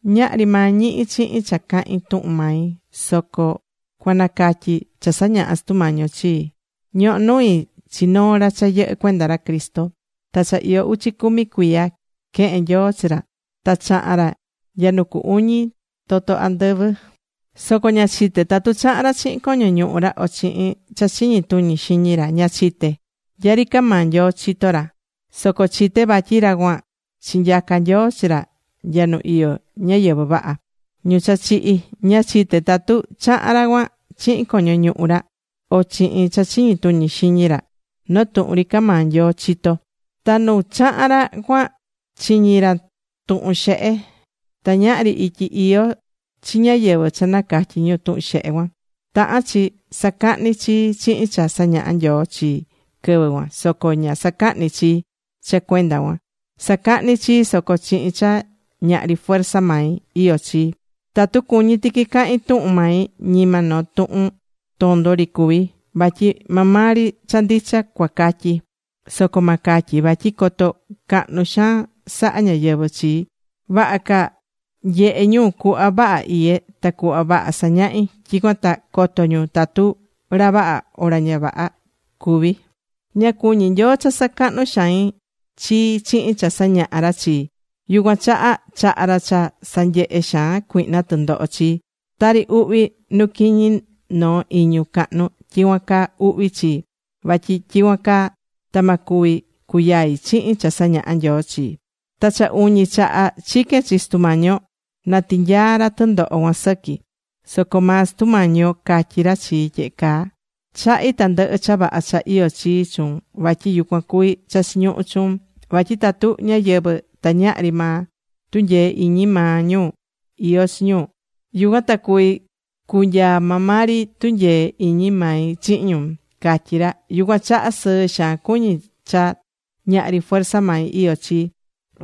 Ñahri maa ñihí chihin cha cahín tuhun mai, soco cuanacatyi cha sañaha̱ Sutu Mañi yo chii. Ñohó nui chi noo ra cha yɨhɨ́ cuenda ra Cristo. Ta cha iyó uchi cumi cuiya quehe̱n Nyoo chi ra ta chaha̱n ra nya nu cu uñi toto andɨvɨ. Soco ña chité tatu chaha̱n ra chihin coño ñuhu ra o chihin cha chiñi tuñi xiñi ra. Ña chité. Nya ri ca maa Nyoo chitó ra. Soco chité vatyi ra cuan chinyaca Nyoo chi ra nya nu iyó ñáyɨvɨ vaha, ñu cha chihi̱. Ña chité tatu chaha̱n ra cuan chihin coño ñuhu ra o chihin cha chiñi tuñi xiñi ra. Noo tuhun ri ca maa Nyoo chitó. Ta nu chahan ra cuan chiñi̱ ra tuhun xehe. Ta ñahri ityi iyó chi ñáyɨvɨ cha nacatyí ñu tuhun xehe cuan. Tahán chi sacahní chii chihin cha sañahá Nyoo chii quɨvɨ cuan. Soco ña sacahní chii cha cuenda cuan. Sacahní chii, soco chihin cha ñahri fuerza mai iyó chii. Tatu cuñí tiqui cahín tuhun mai, ñima noo tuhun tondo ri cuví. Vatyi maa maa ri cha ndicha cuacatyi. Soco ma catyi vatyi coto cahnu xaan sahá ñáyɨvɨ chii. Vaha ca nyehe ñu cuhva vaha iyé ta cuhva vaha sañahí, tyicuan ta coto ñu tatu ra vaha o ra ña vaha cuví. Ña cuñí Nyoo cha sacahnú xain chii chihin cha sañahá ra chii. Yucuan chaha chahá ra cha sanyehé xaan cuihna tɨndoho chii. Tari uhvi nu quiñi noo iñu cahnu, tyicuan caa uhvi chii. Vatyi tyicuan caa ta ma cuvi cuyai chihin cha sañahá Nyoo chii. Ta cha uñi chaha chique̱n chi Sutu Mañi yo na tinyaa ra tɨndoho cuan sɨqui. Soco maa Sutu Mañi yo catyí ra chii tyehe caa: “Chahí tandɨhɨ cha vaha cha iyó chii chuun. Vatyi yucuan cuví cha chiñuhú chuun. Vatyi tatu ñáyɨvɨ ta ñahri maa tunyee iñi maa ñu iyó chi ñu, yucuan ta cuví cunyaa maa maa ri tunyee iñi mai chihin ñu”, catyí ra. Yucuan chaha sɨɨ xaan cuñí cha ñahri fuerza mai iyó chii.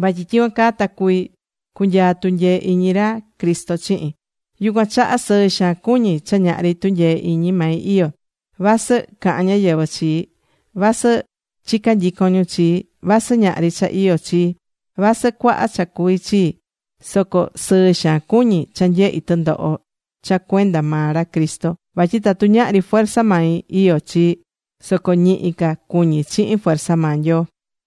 Vatyi tyicuan caa ta cuví cunyaa tunyee iñi ra Cristo chihin. Yucuan chaha sɨɨ xaan cuñí cha ñahri tunyee iñi mai iyó chii. Vasɨ cahán ñáyɨvɨ chii, vasɨ chicá nyicon ñu chii, vasɨ ñahri cha iyó chii, vasɨ cuaha cha cuví chii, soco sɨɨ xaan cuñí cha nyehí tɨndoho cha cuenda maa ra Cristo. Vatyi tatu ñahri fuerza mai iyo chii, soco ñihi ca cuñí chihin fuerza maa Nyoo.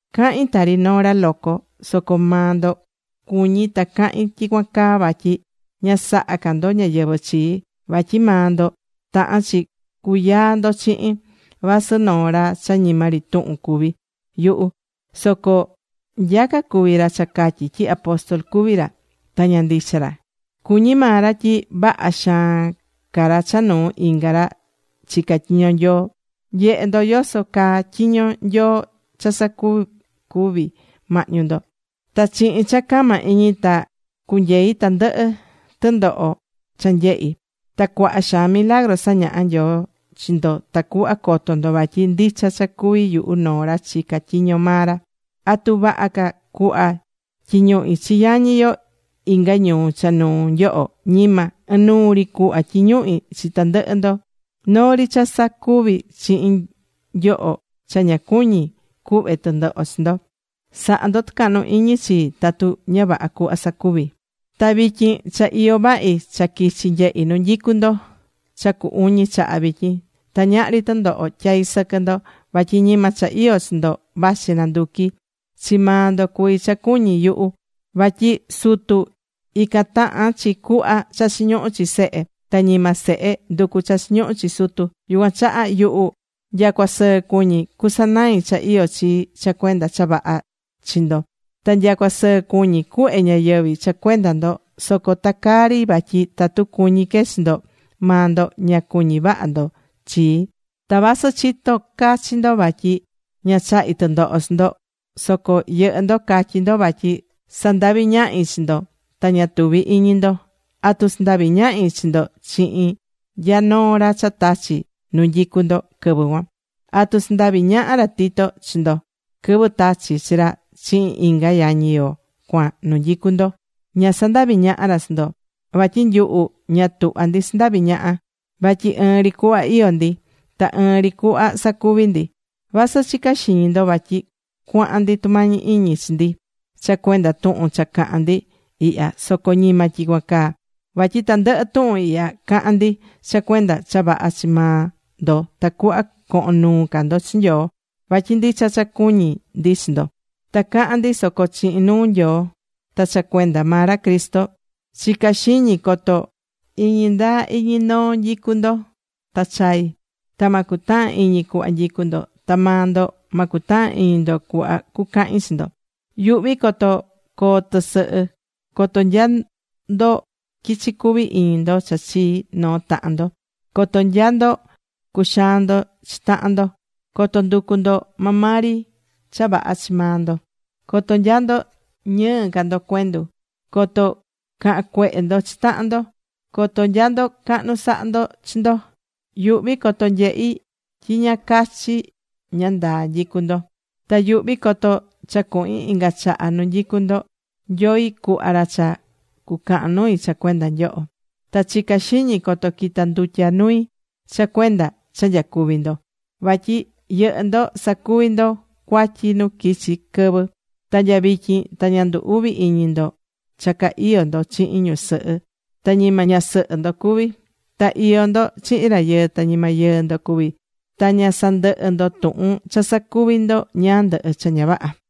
Cahín tari noo ra loco. Soco maa ndo cuñí ta cahín tyicuan caa vatyi ña sahá ca ndo ñáyɨvɨ chii. Vatyi maa ndo tahán chi cuyaa ndo chihin. Vasɨ noo ra cha ñima ri tuhun cuví yuhu, soco nyaca cuví ra cha catyí tyi apóstol cuví ra, ta ña ndicha ra. Cuñí maa ra tyi vaha xaan ca ra cha nuu inga ra chicá tyiño Nyoo. Nyehe̱ ndo yoso caa tyiño Nyoo cha sacuvi̱ mahñu ndo. Ta chihin cha cama iñi ta cunyei̱ tandɨhɨ tɨndoho cha nyehi̱. Ta cuaha xaan milagru sañaha̱ Nyoo chi ndo tacuhva coto ndo vatyi ndicha cha cuví yuhu noo ra chicá tyiño maa ra. ¿Atu vaha ca cuhva tyiñuhí chi yañi yo inga ñuu cha nuu nyoho? Ñima. Inuu ri cuhva tyiñuhí chi tandɨhɨ ndo. Noo ri cha ña sacuví chihin nyoho cha ña cuñí cuhve tɨndoho chi ndo. Sa̱ha ndo tɨcahnu iñi chii tatu ña vaha cuhva sacuví. Ta vityin cha iyó vahi cha quichi nyehi nu nyicu ndo. Cha cu uñi chaha vityin. Ta ñahri tɨndoho tyaí sɨquɨ ndo. Vatyi ñima cha iyó chi ndo vachí nanduquí. Chi maa ndo cuví cha cuñí yuhu. Vatyi sutu, ican tahan chi cuhva cha chiñuhú chi sehe. Ta ñima sehe nducú cha chiñuhú chi sutu. Yucuan chaha yuhu nyacua sɨɨ cuñí cusanai cha iyó chii cha cuenda cha vaha chi ndo. Ta nyacua sɨɨ cuñí cuhve ñayɨvi̱ cha cuenda ndo. Soco ta caa ri vatyi tatu cuñí que chi ndo, maa ndo ña cuñí vaha ndo chii. Ta vasɨ chitó cachi ndo vatyi ña chahí tɨndoho chi ndo, soco yɨhɨ́ ndo catyí ndo vatyi sandaví ñahi chi ndo ta ña tuví iñi ndo. ¿Atu sandavi̱ ñahi chi ndo chihin nya noo ra cha tachi̱ nu nyicu ndo quɨvɨ cuan? ¿Atu sandavi̱ ñaha ra Tito chi ndo quɨvɨ tachi̱ chi ra chihin inga yañi yo cuan nu nyicu ndo? Ña sandavi̱ ñaha ra chi ndo. Vatyi nyuhu ña tuhvá ndi sandaví ñaha. Vatyi ɨɨn ri cuhva iyó ndi. Ta ɨɨn ri cuhva sacuví ndi. Vasɨ chicá xiñi ndo vatyi cuahan ndi tumañi iñi chi ndi cha cuenda tuhun cha cahán ndi ihya, soco ñima tyicuan caa. Vatyi tandɨhɨ tuhun ihya cahán ndi cha cuenda cha vaha chi maa ndo tacuhva cohon nuu ca ndo chi Nyoo. Vatyi ndicha cha cuñí ndi chi ndo. Ta cahán ndi soco chihin nuu Nyoo ta cha cuenda maa ra Cristo. Chicá xiñi coto iñi ndaa iñi noo nyicú ndo ta chaí. Ta ma cutahan iñi cuhva nyicú ndo. Ta maa ndo ma cutahan iñi ndo cuhva cucahin chi ndo. Yuhví coto coo tɨsɨhɨ, coto nya ndo quichí cuvi iñi ndo cha chii noo tahan ndo, coto nya ndo cuxaán ndo chi tahan ndo, coto nducú ndo maa maa ri cha vaha chi maa ndo, coto nya ndo ñɨɨ ca ndo cuendu, coto cahán cuehe ndo chi tahan ndo, coto nya ndo cahnu sahá ndo chi ndo. Yuhví coto nyehi tyi ña cachi ña ndaa nyicú ndo. Ta yuhví coto cha cuhin inga chaha nu nyicú ndo, Nyoi cuhva ra cha cucahan nui cha cuenda nyoho. Ta chicá xiñi coto quita ndutya nui cha cuenda cha nyacuví ndo. Vatyi yɨhɨ́ ndo sacuví ndo cuatyi nu quichi̱ quɨvɨ. Ta nya vityin ta ña ndu uví iñi ndo cha ca iyó ndo chihin ñusɨhɨ ta ñima ñasɨhɨ ndo cuví, ta iyó ndo chihin rayɨɨ ta ñima yɨɨ ndo cuví. Ta ña sandɨhɨ́ ndo tuhun cha sacuví ndo ñáá ndɨhɨ cha ña vaha.